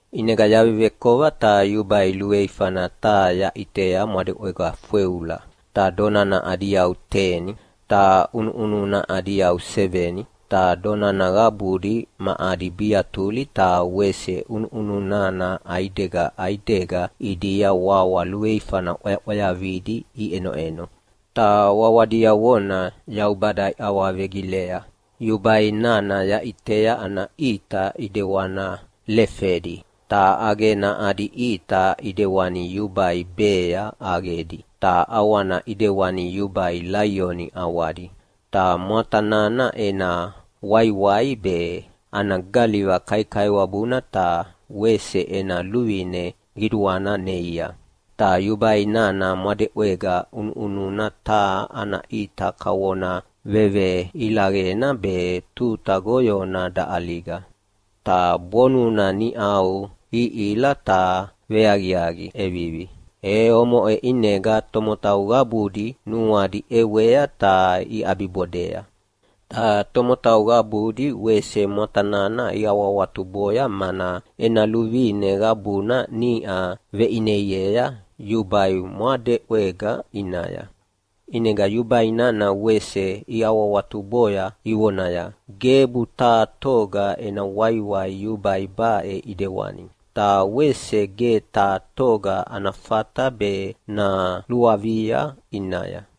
ʼInega yavevekova ta yubai luveifana taha yaʼitea mwadeʼwega fweula. Ta donana adi yau teni, ta ʼunuʼununa adi yau seveni, ta donana qabudi ma adi biatuli ta wese ʼunuʼununa ʼaidega ʼaidega ʼidia wawa luveifana ʼwayaʼwayavidi iʼenoʼeno, ta wawa diavona Yaubada iawavegilea. Yubai nana yaʼitea ana ʼita ʼidewana lefedi, ta ʼaqena adi ʼita ʼidewani yubai bea ʼaqedi, ta ʼawana ʼidewani yubai laioni ʼawadi. Ta mwata nana ena waiwai be, ana galiva kaikaiwabuna ta wese ena luvine qiduana neia. Ta yubai nana mwadeʼwega ʼunuʼununa taha ana ʼita kavona veveilaqena be tuta goyona daʼaliga, ta bonuna niʼau ihila ta veaqiaqi ʼevivi. E omoʼe ʼinega tomotau qabudi nuadi ʼewea ta iʼabibodea. Ta tomotau qabudi wese mwata nana iawahawatuboya, mana ena luvine qabuna niʼa veʼineiea yubai mwadeʼwega ʼinaya. ʼInega yubai nana wese iawahawatuboya ivonaya, “Gebu taha toga ena waiwai yubai baʼe ʼidewani. Ta wese ge taha toga ana fata be naluavia ʼinaya!”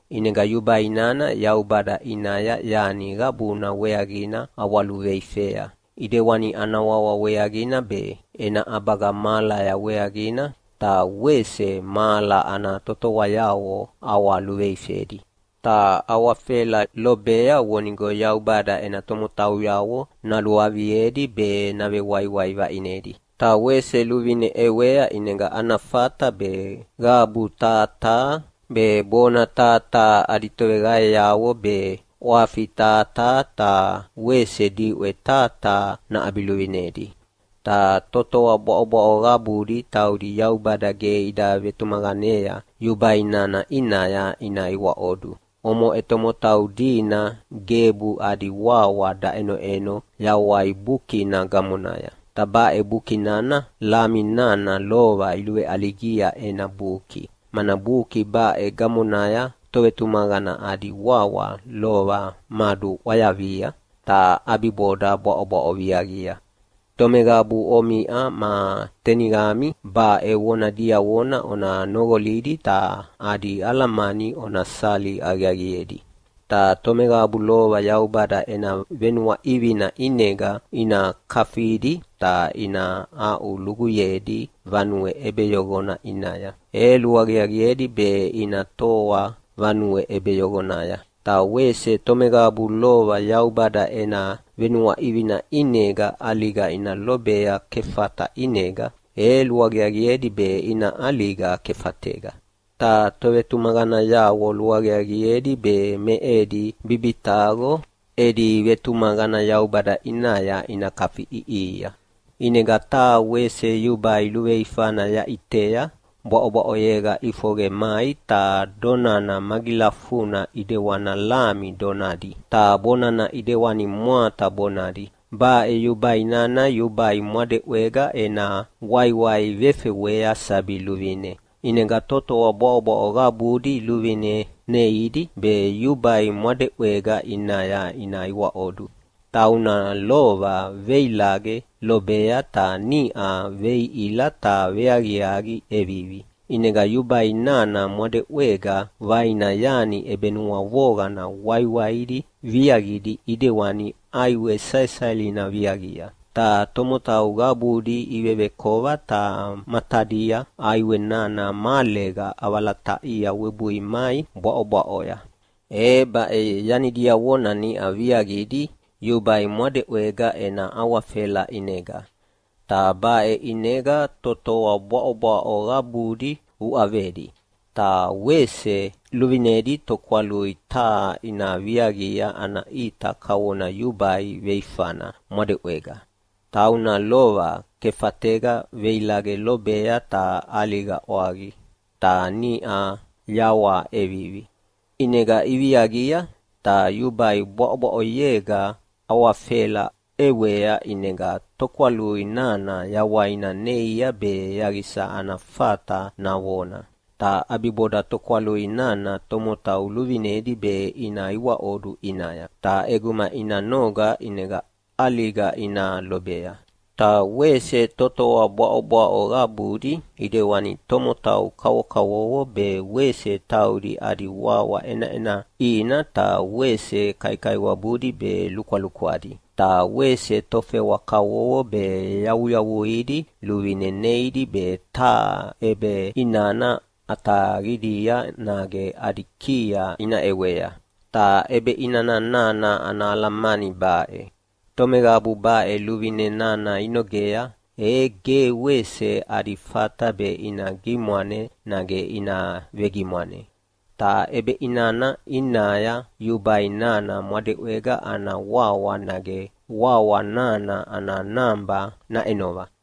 ʼInega yubai nana Yaubada ʼinaya yani qabuna weaqina ʼawaluveifea, ʼidewani ana wawa weaqina be, ena ʼabaga mahalaya weaqina, ta wese mahala ana totoayavo ʼawaluveifedi. Ta awafela lobea vonigo Yaubada ena tomotauyavo naluaviedi be navewaiwai vaʼinedi. Ta wese luvine ʼewea ʼinega ana fata be qabu taha taha, be bona taha taha adi toveqaeavo be, ʼwafi taha taha ta wese diʼwe taha taha naʼabiluvinedi. Ta totoa bwaʼobwaʼo qabudi taudi Yaubada ge ida vetumaqanea yubai nana ʼinaya ina iwaiwaʼodu, omoʼe tomotau dina gebu adi wawa daʼenoʼeno Yawai Bukina gamonaya. Ta baʼe buki nana Lami nana lova iluveʼaligia ena buki, mana buki baʼe gamonaya tovetumaqana adi wawa lova maduʼwayavia, ta ʼabiboda bwaʼobwaʼo viaqia. Tomeqabu omiʼa ma teniqami baʼe vona diavona ona noqolidi ta adi alamani ona sali aqiaqiedi. Ta tomeqabu lova Yaubada ena venuaʼivina ʼinega ina kafidi ta ina aʼuluguyedi vanue ʼebeyoqona ʼinaya, e luaqiaqiedi be ina toa vanue ʼebeyoqonaya. Ta wese tomeqabu lova Yaubada ena venuaʼivina ʼinega ʼaliga ina lobea kefata ʼinega, e luaqiaqiedi be ina ʼaliga kefatega. Ta tovetumaqanayavo luaqiaqiedi be me edi bibitaqo edi vetumaqana Yaubada ʼinaya ina kafiʼiʼihia. ʼInega taha wese yubai luveifana yaʼitea, bwaʼobwaʼoyega ʼifoqe mai. Ta donana magilafuna ʼidewana lami donadi, ta bonana ʼidewani mwata bonadi. Baʼe yubai nana yubai mwadeʼwega ena waiwai vefewea sabi luvine, ʼinega totoa bwaʼobwaʼo qabudi luvine neidi be yubai mwadeʼwega ʼinaya ina iwaʼodu, tauna lova veilaqe lobea ta niʼa veihila ta veaqiaqi ʼevivi. ʼInega yubai nana mwadeʼwega vaina yani ʼebenuavoqana waiwaidi viaqidi ʼidewani ʼaiwe saesaelina viaqia, ta tomotau qabudi ivevekova ta matadia ʼaiwe nana mahalega ʼavalataʼia webui mai bwaʼobwaʼoya. E baʼe yani diavona niʼa viaqidi yubai mwadeʼwega ena awafela ʼinega, ta baʼe ʼinega totoa bwaʼobwaʼo qabudi uʼavedi. Ta wese luvinedi tokwalui taha ina viaqia ana ʼita kavona yubai veifana mwadeʼwega, tauna lova kefatega veilaqe lobea ta ʼaliga ʼwaqi, ta niʼa yawaha ʼevivi. ʼInega iviaqia, ta yubai bwaʼobwaʼoyega awafela ʼewea ʼinega tokwalui nana yawaina neia be yaqisa ana fata navona. Ta ʼabiboda tokwalui nana tomotau luvinedi be ina iwaʼodu ʼinaya, ta ʼeguma ina noga ʼinega ʼaliga ina lobea. Ta wese totoa bwaʼobwaʼo qabudi ʼidewani tomotau kavokavovo be wese taudi adi wawa ʼenaʼina, ta wese kaikaiwabudi be lukwalukwadi, ta wese tofewa kavovo be yavuyavuidi luvine neidi be taha ʼebeʼinana ʼataqidia nage adi kiaya ina ʼewea. Ta ʼebeʼinana nana ana alamani baʼe: Tomeqabu baʼe luvine nana inogea, e ge wese adi fata be ina gimwane nage ina vegimwane. Ta ʼebeʼinana ʼinaya yubai nana mwadeʼwega ana wawa nage wawa nana ana naba naʼenova.